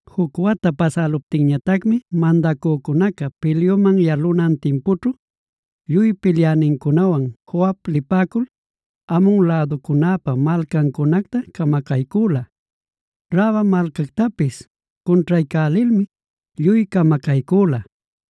Juc wata pasäluptinñatacmi mandacücunaca pilyuman yalunan timpućhu, lluy pilyänincunawan Joab lipäcul, Amon läducunäpa malcancunacta camacaycüla. Raba malcactapis cunćhaycälilmi lluy camacaycüla.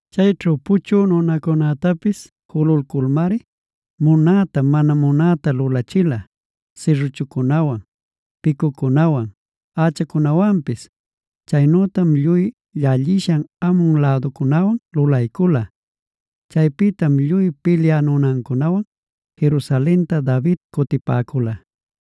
Chayćhu puchü nunacunätapis jululculmari, munäta mana munäta lulachila: sirruchucunawan, picucunawan, ächacunawanpis. Chaynütam lluy llallishan Amon läducunäwan lulaycula. Chaypïtam lluy pilyä nunancunawan Jerusalenta David cutipäcula.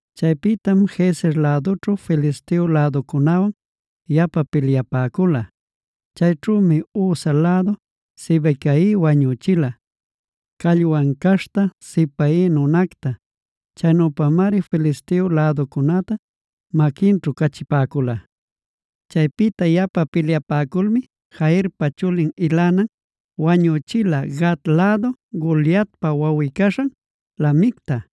Chaypïtam Gezer lädućhu Filisteo läducunäwan yapa pilyapäcula. Chayćhümi Husha lädu Sibecai wañüchila, callwan caśhta Sipai nunacta. Chaynüpamari Filisteo läducunäta maquinćhu cachipäcula. Chaypïta yapa pilyapäculmi Jairpa chulin Elhanan wañüchila Gat lädu Goliatpa wawꞌi-caśhan Lahmicta.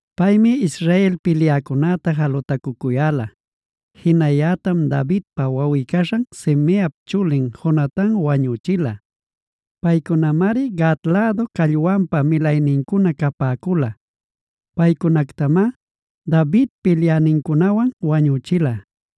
Paymi Israel pilyäcunäta jalutacucuyäla. Jinayätam Davidpa wawꞌi-caśhan Simeap chulin Jonatan wañüchila. Paycunamari Gat lädu callwanpa milaynincuna capäcula. Paycunactamá David pilyänincunawan wañüchila.